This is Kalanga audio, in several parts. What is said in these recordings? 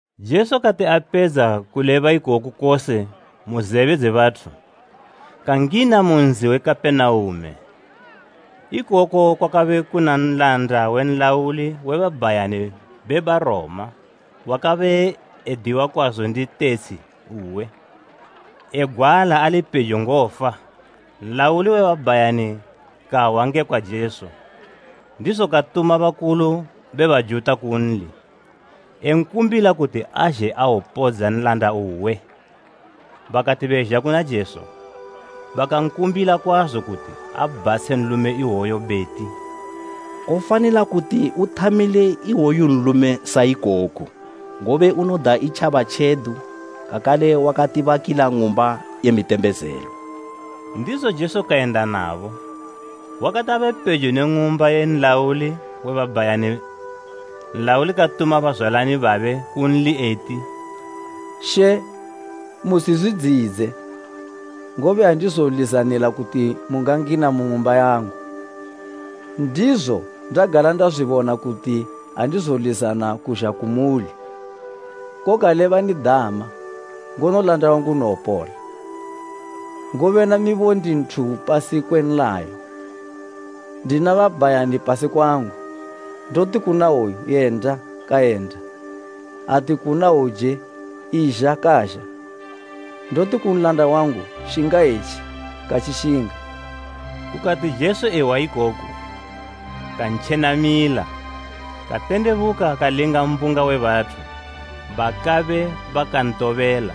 Jesu kati apedza kuleba ikoku kose mu zebe dze bathu, kangina mu nzi we Kapenaume. Ikoko kwakabe kuna nlanda we nlauli we babhayani be Baroma wakabe ediwa kwazo ndi tetshi uwe, egwala ali pejo ngofa. Nlauli we babhayani kahwa ngekwa Jesu, ndizo katuma bakulu be Bajuta kunli, enkumbila kuti azhe awopodza nlanda uwe. Bakati bezha kuna Jesu, bakankumbila kwazo kuti abhatshe nlume iwoyo beti, “Kofanila kuti uthamile iwoyu nlume sa ikoku, ngobe unoda itjaba tjedu, kakale wakati bakila ng'umba ye mitembezelo.” Ndizo Jesu kayenda nabo. Wakati abe pejo ne ng'umba ye nlauli we babhayani nlauli katuma bazwalani babe kunli eti, “She, musizwidziyidze, ngobe andizolizanila kuti mungangina mu ng'umba yangu. Ndizo, ndagala ndazwibona kuti andizolizana kuzha kumuli. Koga lebani dama, ngono nlanda wangu unowopola. Ngobe namibo ndi nthu upasi kwe nlayo, ndina babhayani pasi kwangu. Ndoti kuna iwoyu, ‘Yenda,’ kayenda, ati kuna hwouje, ‘Izha,’ kazha. Ndoti ku nlanda wangu, ‘Shinga etji,’ katjishinga.” Kukati Jesu ehwa ikoku, kantjenamila, katendebuka kalinga mbunga we bathu bakabe bakantobela,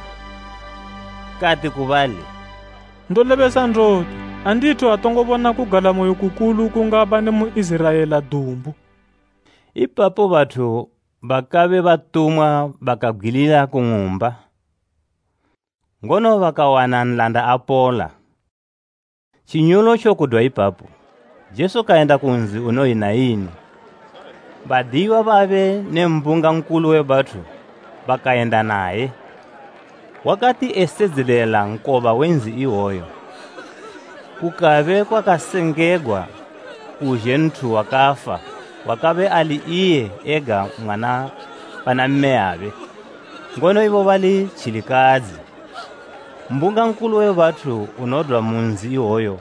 kati ku bali, “Ndolebesa ndoti, andithu atongo bona kugalamoyo kukulu kungapa ne mu Iziraela dumbu.” Ipapo bathu bakabe batumwa bakabgwilila ku ng'umba, ngono bakawana nlanda apola. Tjinyolotjo kudwa ipapo, Jesu kayenda ku nzi unoyi Naini, badiyiwa babe ne mbunga nkulu we bathu bakayenda naye. Wa kati esedzelela nkoba we nzi iwoyo, kukabe kwakasengegwa kuzhe nthu wakafa wakabe ali iye ega mwana pana mmeyabe, ngono ibo bali tjilikadzi. Mbunga nkulu we bathu unodwa mu nzi iwoyo,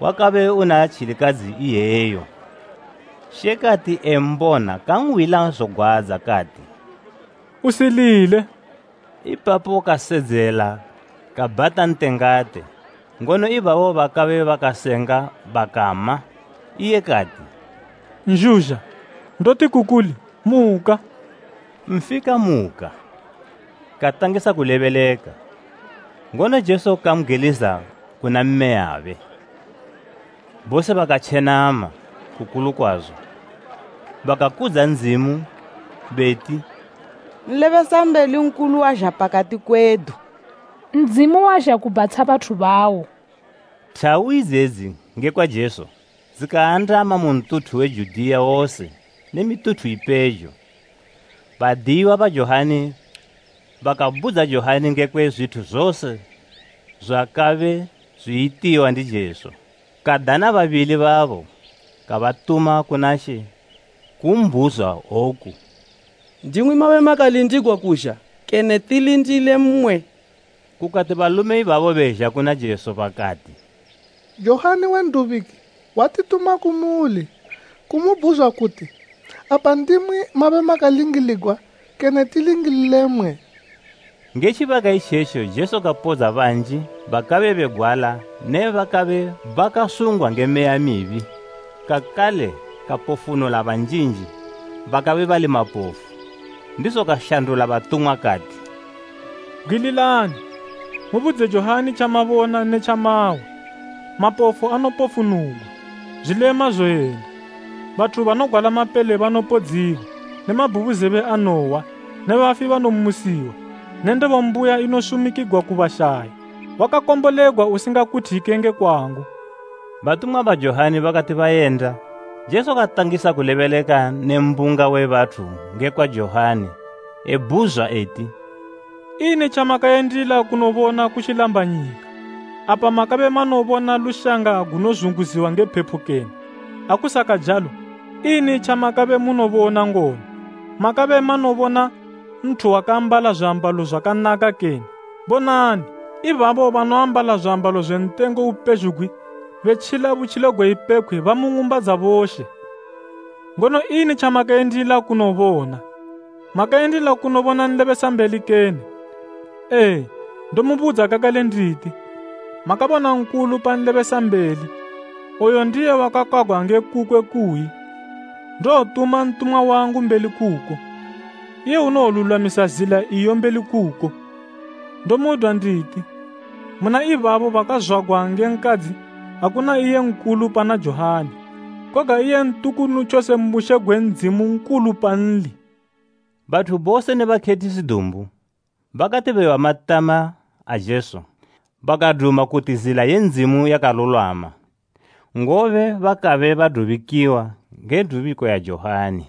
wakabe una tjilikadzi iyeyo. She kati embona kanhwila zogwadza kati, “Usilile.” Ipapo kasedzela kabhata ntengate, ngono ibabo bakabe bakasenga bakama. Iye kati, “Nzhuzha, ndoti ku kuli, muka!” Nfi kamuka, katangisa kulebeleka, ngono Jesu kambgwiliza kuna mmeyabe. Bose bakatjenama kukulu kwazo, bakakudza Ndzimu beti, “Nlebesambeli nkulu wazha pakati kwedu! Ndzimu wazha kubhatsha bathu bawo.” Thawu idzedzi ngekwa Jesu dzikaandama mu ntuthu we Judiya wose ne mituthu ipejo. Badiyiwa ba Johani bakabudza Johani ngekwe zwithu zose zwakabe zwiyitiwa ndi Jesu. Kadana babili babo, kabatuma kuna She kumbhuzwa woku, “Ndimwi mabe makalindigwa kuzha, kene tilindile mmwe?” Kukati balume ibabo bezha kuna Jesu bakati, “Johani we N'dubiki watituma kumuli kumubhuzwa kuti ‘Apa ndimwi mabe makalingiligwa, kene tilingilile mmwe?’” Nge tjibaka itjetjo Jesu kapodza banji bakabe begwala ne bakabe bakasungwa nge meya mibi, kakale kapofunula banjinji bakabe bali mapofu. Ndizo kashandula batumwa kati, “Bgwililani, mubudze Johani tjamabona ne tjamahwa. Mapofu anopofunugwa, zwilema zoyenda, bathu banogwala mapele banopodziwa ne mabhubuzebe anohwa ne bafi banomusiwa ne ndebo mbuya inosumikigwa ku bashayi. Wakakombolegwa usingakuthike nge kwangu.” Batumwa ba Johani bakati bayenda, Jesu katangisa kulebeleka ne mbunga we bathu ngekwa Johani, ebhuzwa eti, “Ini tjamakayendila kunobona ku tjilambanyika? Apa makabe manobona lushanga gunozunguziwa nge phepo kene? Akusakajalo, ini tjamakabe munobona ngono? Makabe manobona nthu wakaambala zwiambalo zwakanaka kene? Bonani, ibabo banoambala zwiambalo zwe ntengo upezhugwi betjila butjilo gwe ipepkhwe ba mu ng'umba dza boshe. Ngono ini tjamakayendila kunobona? Makayendila kunobona nlebesambeli kene? Ee, ndomubudza kakale nditi, makabona nkulu pa nlebesambeli. Oyu ndiye wakakwagwa nge kukwe kuyi, “ ‘Ndowotuma ntumwa wangu mbeli kuko, iye unowolulwamisa zila iyo mbeli kuko.’ “Ndomudwa nditi, muna ibabo bakazwagwa nge nkadzi, akuna iye nkulu pana Johani; koga iye ntukunu tjose mu bushe gwe Ndzimu nkulu panli.” Bathu bose ne bakhethisi dumbu, bakati behwa matama a Jesu bakaduma kuti zila ye Ndzimu yakalulwama, ngobe bakabe badubikiwa nge dubiko ya Johani.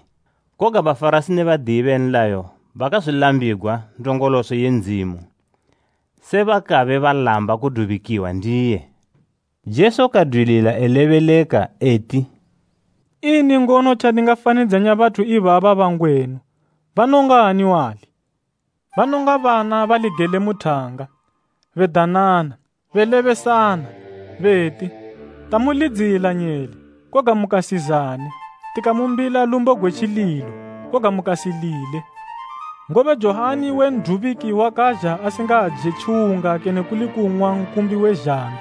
Koga Bafarasi ne badiyi be nlayo bakazwilambigwa ndongoloso ye Ndzimu, se bakabe balamba kudubikwa ndiye. Jesu kadwilila elebeleka eti, “Ini ngono tjandingafanidzanya bathu ibaba bangwenu? Banongani wali? Banonga bana bali gele mu thanga, bedanana, belebesana, beti, ‘Tamulidzila nyele, koga mukasizane, tikamumbila lumbo gwe tjililo koga mukasilile.’ Ngobe Johani we N'dubiki wakazha asingaje tjiwunga kene kuli kung'wa nkumbi we zhambi,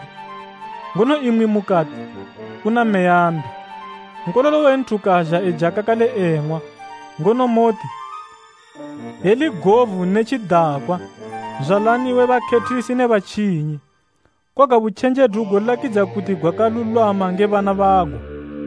ngono imwi mukati, ‘Una meya mbi.’ Nkololo we Nthu kazha eja kakale eng'wa, ngono moti, ‘Yeli govu ne tjidakwa, nzwalani we bakhethisi ne batjinyi.’ Koga butjenjedu golakidzika kuti gwakalulwama nge bana bago.”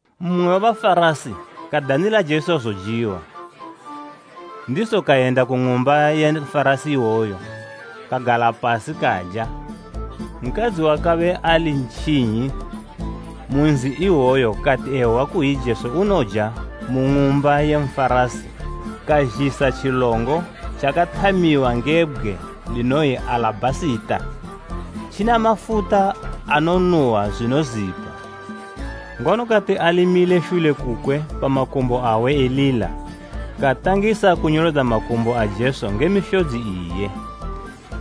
Mmwe we Bafarasi kadanila Jesu zojiwa, ndizo kayenda ku ng'umba ye Nfarasi iwoyo kagala pasi kaja. Nkadzi wakabe ali ntjinyi mu nzi iwoyo kati ehwa kuyi Jesu unoja mu ng'umba ye Nfarasi, kazhisa tjilongo tjakathamiwa nge bgwe linoyi alabhasita, tjina mafuta anonuhwa zwinozipa. Ngono kati ali mile shule kukwe pa makumbo awe elila, katangisa kunyolodza makumbo a Jesu nge mishodzi iye.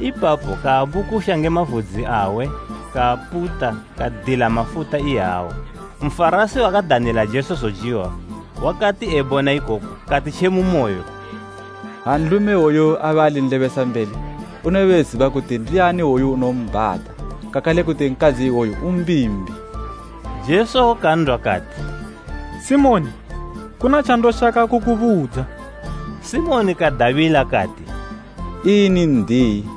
Ipapo kaabukusha nge mavudzi awe kaaputa kadila mafuta iyawo. Nfarasi wakadanila Jesu zojiwa wakati ebona ikoku kati tje mu moyo, “Ha nlume iwoyu abe ali nlebesambeli, unobe eziba kuti ndiani iwoyu unombhata kakale kuti nkadzi iwoyu umbimbi.” Jesu kan'dwa kati, “Simoni, kuna tjandoshaka kukubudza.” Simoni kadabila kati, “Ini n'diyi.”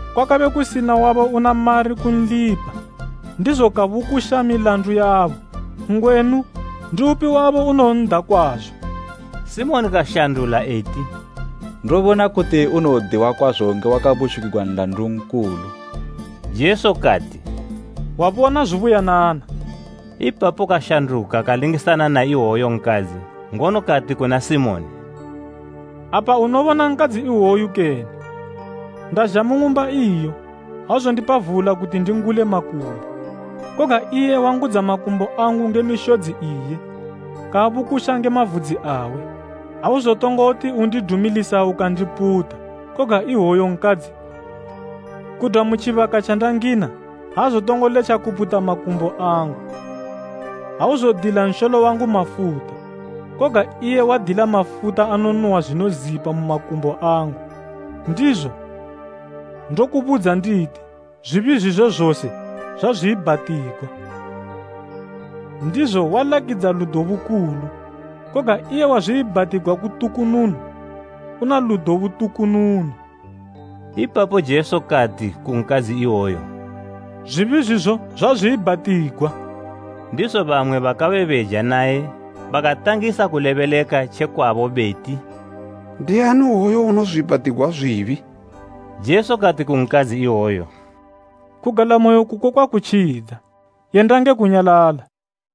Kwakabe kusina wabo una mari kunlipa, ndizo kabukusha milandu yabo. Ngwenu, ndiupi wabo unowon'da kwazo?” Simoni kashandula eti, “Ndobona kuti unowodiwa kwazo nge wakabukushigwa nlandu nkulu.” Jesu kati, “Wabona zubuyanana.” Ipapo kashanduka kalingisana na iwoyo nkadzi, ngono kati kuna Simoni, “Apa unobona nkandzi iwoyu, kene? Ndazha mu ng'umba iyo, auzondipa vula kuti ndingule makumbo, koga iye wangudza makumbo angu nge mishodzi iye, kaabukusha nge mavudzi awe. Auzotongoti undidumilisa ukandiputa koga iwoyu nkadzi, kudwa mu tjibaka tjandangina, aazotongo letja kuputa makumbo angu. Auzodila nsholo wangu mafuta, koga iye wadila mafuta anonuhwa zwinozipa mu makumbo angu. Ndizo, ndokubudza nditi, zwibi zwizwe zose zwazwiibhatigwa, ndizo walakidza ludo bukulu. Koga iye wazwiibhatigwa kutukununu, una ludo butukununu.” Ipapo Jesu kati ku nkadzi iwoyo “Zwibi zwizo zwazwiibhatigwa.” Ndizo bamwe bakabe beja naye bakatangisa kulebeleka tjekwabo beti, “Ndiani iwoyu unozwiibhatigwa zwibi?” Jesu kati ku nkadzi iwoyo, “Kugalamoyo kuko kwakutjidza, yenda nge kunyalala!”